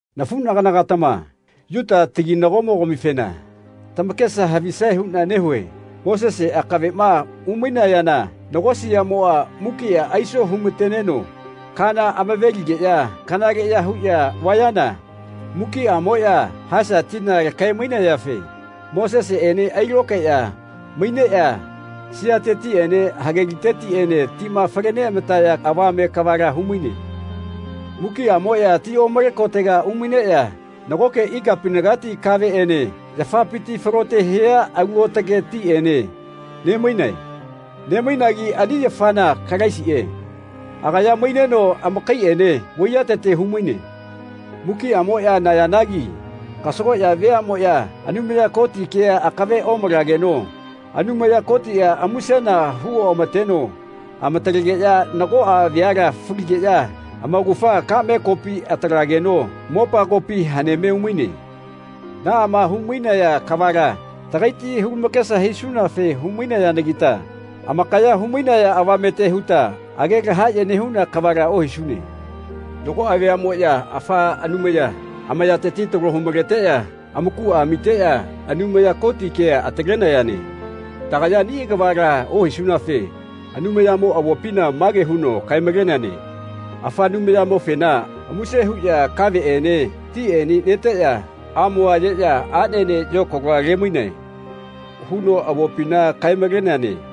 Nafuꞌnagana-gatama Yuta taginagomo-gamifena tamakesa havisae huꞌna nehue. Mosese akaveꞌma umainayana nago siaꞌmoꞌa mukiꞌa aiso humateneno kana amaveligeꞌya kanaleꞌya huꞌya vayana mukiꞌamoꞌya Haesa tina lakae-mainayafe Moseseꞌene ailokaeꞌya maineꞌya siatetiꞌene hage litetiꞌene tima fale neamataya avame kavala humaine. Mukiꞌamoꞌya ti omale kotega umaineꞌya nagoke ikapinagati kaveꞌene yafapiti falote hia alu aotage tiꞌene ne-mainae. Ne-mainagi ani yafana Kalaisiꞌe. Agaya maineno amakaiꞌene vaiyatete humaine. Mukiꞌamoꞌya nayanagi kasagoꞌya veaꞌmoꞌya Anumaya Koti kea akave omalageno Anumaya Kotiꞌa musena hu oꞌamateno amatalegeꞌya nagoꞌa veala faligeꞌya amaugafa kaꞌme kopi atalegeno mopagopi haneme umaine. Naꞌama humainaya kavala tagaiti hulamakesa hisunafe hu-mainayanagita amakaya humainaya avamete huta age lahaꞌye nehuna kavala ohisune. Nagoꞌa veaꞌmoꞌya afa anumaya, amayateti talo humaleteꞌya amakuꞌa amiteꞌya Anumaya Koti kea atalenayane. Tagaya ani kavala ohisunafe Anumayamo avopina mage huno kae-maleneane “Afa anumayamofena muse huꞌya kaveꞌene tiꞌene neteꞌya amoa ayeꞌya aꞌnene yokaloa lemainae.” huno avopina kae-maleneane.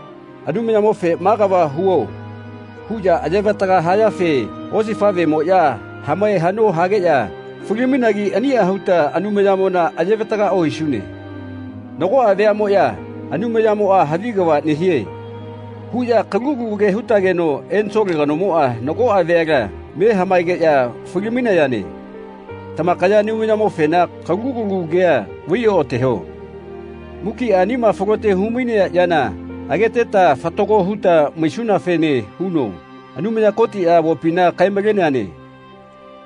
Anumayamofe “Ma kava huo.” huꞌya ayevataga hayafe osifaꞌvemoꞌya hamae haꞌno hageꞌya fali-mainagi aniꞌa huta Anumayamona ayevataga ohisune. Nagoꞌa veaꞌmoꞌya “Anumayamoꞌa havi kava nehie.” huꞌya kalu kalu ke hutageno ensole kanomoꞌa nagoꞌa veala me hamaegeꞌya fali-mainayane. Tamakaya Anumayamofena kalu kalu kea vaioꞌateho. Mukiꞌa anima falote humainea yana ageteta fatago huta maisunafene huno Anumaya Kotiꞌa avopina kae-maleneane.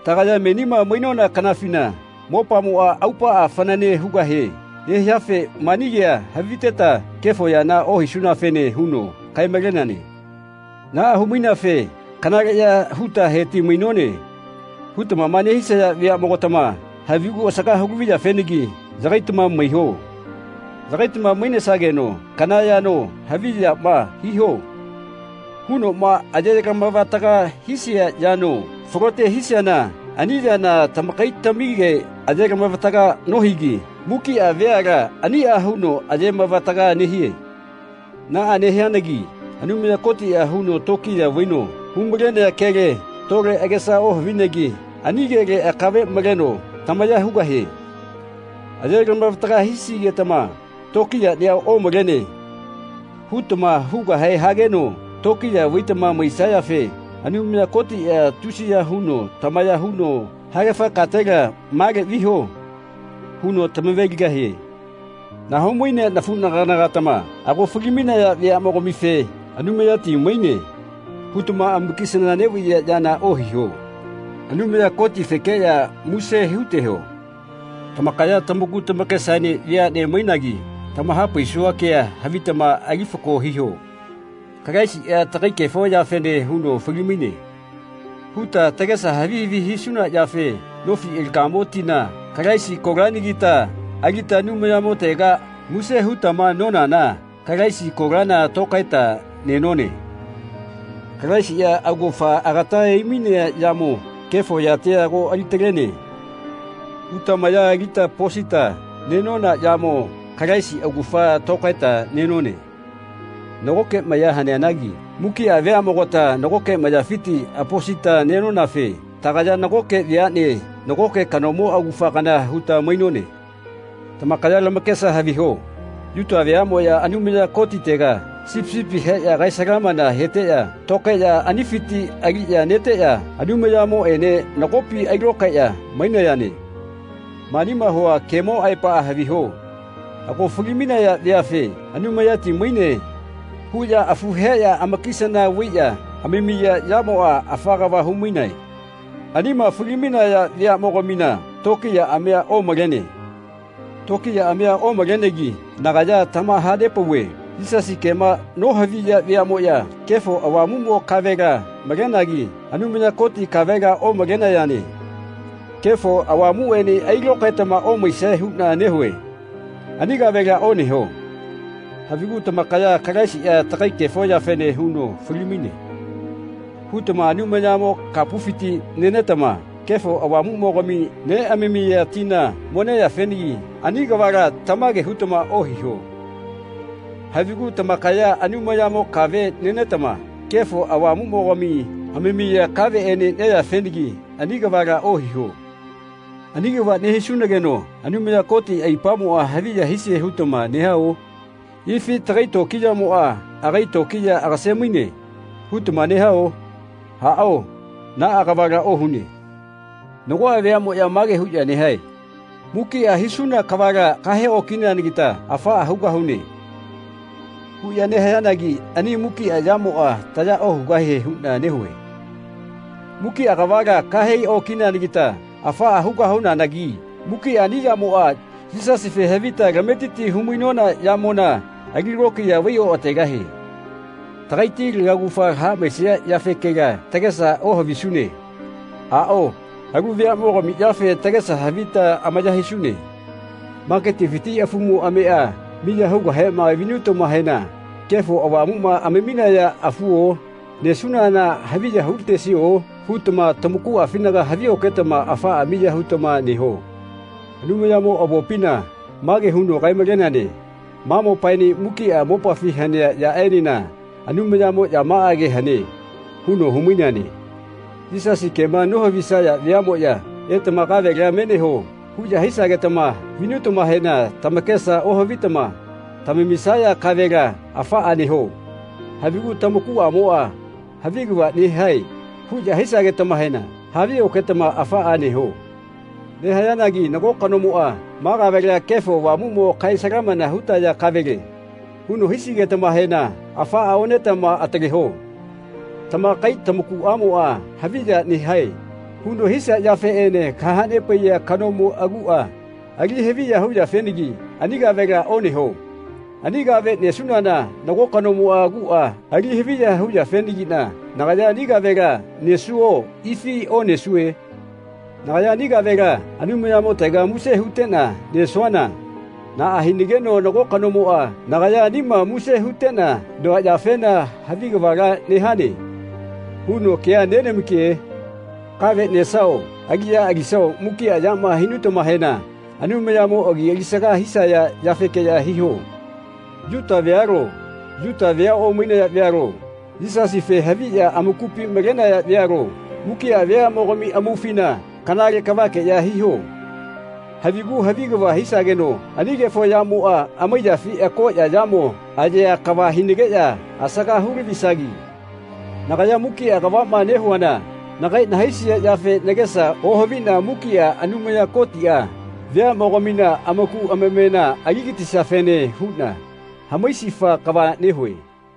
Tagaya menima mainona kanafina mopamoꞌa aupaꞌa fanane hugahe nehiafe mani kea haviteta kefo yana ohisunafene huno kae-maleneane. Naꞌa humaineafe “Kanaleꞌya huta heti-mainone.” hutama nehisaya veaꞌmogatama havigu asaga hu laviyafenagi yagaitama maiho. Yagaitama mainesageno kana yano “Havi yama hiho.” hunoꞌma ayelamavataga hisia yano falote hisiana ani yana tamakaitamige ayelamavataga nohigi mukiꞌa veala aniꞌa huno ayemavataga nehie. Naꞌa nehianagi Anumaya Kotiꞌa huno tokiya vaino humalenea kele tole agesa ohavinegi ani kele akave maleno tamaya hugahie. Ayelamavataga hisigetama “Tokiyaꞌnia omalene.” hutama hugahe hageno tokiya vaitama maisayafe Anumaya Kotiꞌa tusiya huno tamaya huno “Haegafa katela male viho.” huno tamave-ligahie. Nahau-mainea nafuꞌnagana-gatama ago fali-mainaya veaꞌmogamife “Anumayati maine.” hutama amakisana neꞌvaiya yana ohiho. Anumaya Kotifekeꞌya muse huteho. Tamakaya tamaku tamakesaene veaꞌne mainagi tamahapaisua kea havitama ali fako hiho. “Kalaisiꞌa tagai kefo yafene huno fali-maine.” huta tagesa havi havi hisuna yafe nofi alagamo tina, Kalaisi kolanagita alita Anumayamotega muse hutama nonana Kalaisi kolana tokaeta nenone. “Kalaisiꞌa augafa agata aimainea yamo kefo yatia ago alitalene.” huta maya alita aposita nenona yamo Kalaisi augafa tokaeta nenone. Nagoke maya haneanagi mukiꞌa veaꞌmogata nagoke mayafiti aposita nenonafe tagaya nagoke veaꞌne nagoke kanomo augafa kana huta mainone. Tamakaya tamakesa haviho Yuta veaꞌmoya Anumaya Kotitega sipi sipi heꞌya kae-salamana heteꞌya tokaeꞌya anifiti aliꞌya neteꞌya Anumayamoꞌene nagopi ailokaeꞌya mainayane. Manima hua kemo aepaꞌa haviho. Ago fali-mainaya veafe “Anumayati maine.” huꞌya afu heꞌya amakisana vaiꞌya amamiya yamoꞌa afa kava humainae. Anima fali-mainaya veaꞌmogamina tokiyaꞌamia omalene. Tokiyaꞌamia omalenegi nagaya tamahanepauve Yisasi kema nohaviya veaꞌmoꞌya Kefo Avamuꞌmo kavela malenagi Anumaya Koti kavela omalenayane. Kefo Avamuꞌene ailokaetama omaisae huꞌna nehue. Ani kavela oneho. Havigu tamakaya “Kalaisiꞌa tagai kefo yafe huno fali-maine.” hutama Anumayamo kapufiti nenetama Kefo Avamuꞌmogami neꞌamamiya tina mo neyafenagi ani kavala tamage hutama ohiho. Havigu tamakaya Anumayamo kave nenetama Kefo Avamuꞌmogami amamiya kaveꞌene neyafenagi ani kavala ohiho. “Ani kava nehisunageno Anumaya Koti aipamoꞌa haviya hisie hutama nehao? Ifi tagai tokiyamoꞌa agai tokiya agase-maine.” hutama nehao? Aꞌao, naꞌa kavala ohune. Nagoꞌa veaꞌmoꞌya mage huꞌya nehae “Mukiꞌa hisuna kavala kahe okineanagita afaꞌa hugahune.” huꞌya nehayanagi ani mukiꞌa yamoꞌa taya ohugahie huꞌna nehue. Mukiꞌa kavala kahe okineanagita afaꞌa hugahunanagi mukiꞌa ani yamoꞌa Yisasife havita tametiti humainona yamona alilokiya vai oꞌategahie. Tagaiti laugafa haꞌmaesia yafekela tagesa ohavisune. Aꞌao, alu veaꞌmogami yafe tagesa havita amaya hisune. Maketifiti afumo ameꞌa miya hugahema vinutamahena “Kefo Avamuꞌma amaminaya afuo? Nesunana haviya hulatesio?” hutama tamakuꞌafinaga havio-ketama afaꞌa miya hutama neho. Anumayamo avopina mage huno kae-maleneane “Ma mopaene mukiꞌa mopafi hanea yaꞌenena Anumayamo yamaꞌage hane.” huno humaineane. Yisasi kema nohavisaya veaꞌmoꞌya “Etama kavela me neho.” huꞌya hisagetama vinutamahena tamakesa ohavitama tamamisaya kavela afaꞌa neho. Havigu tamakuꞌamoꞌa “Havi kava nehae.” huno hisagetama havioketama afaꞌa neho. Negahayanagi nago kanomoꞌa “Ma kavela Kefo Avamuꞌmo kae-salamana hutaya kavele.” huno hisigetamahena afaꞌa onetama ataleho. Tamakai tamakuꞌamoꞌa “Havi ya nehae.” huno hisia yafeꞌene kahanepaiya kanomo aguꞌa ali haviya huyafenagi ani kavela oneho. Ani kave nesuana nago kanomo aguꞌa ali haviya hu-yafenagiꞌna nagaya ani kavela nesuo ifi onesue? Nagaya ani kavela Anumayamotega muse huteꞌna nesuana naꞌa hinageno nago kanomoꞌa nagaya anima muse huteꞌna noa yafena “Havi kavala nehane.” huno kea nenamake? Kave nesao aliꞌya alisao mukiꞌa yama hinutamahena Anumayamo agia alisaga hisaya yafeke hiho. Yuta vealo, Yuta vea omainaya vealo, Yisasife haviꞌya amakupi malenaya vealo, mukiꞌa veaꞌmogami amaufina kanale kavakeꞌya hiho. Havigu havi kava hisageno ani kefo yamoꞌa amaiyafi akoꞌya yamo ayea kava hinageꞌya asaga hu-lavisagi. Nagaya mukiꞌa kavaꞌma nehuana nagai nahaisia yafe nagesa ohaviꞌna mukiꞌa Anumaya Kotiꞌa veaꞌmogamina amaku amamena aligatisiafene huꞌna hamaisifa kava nehue.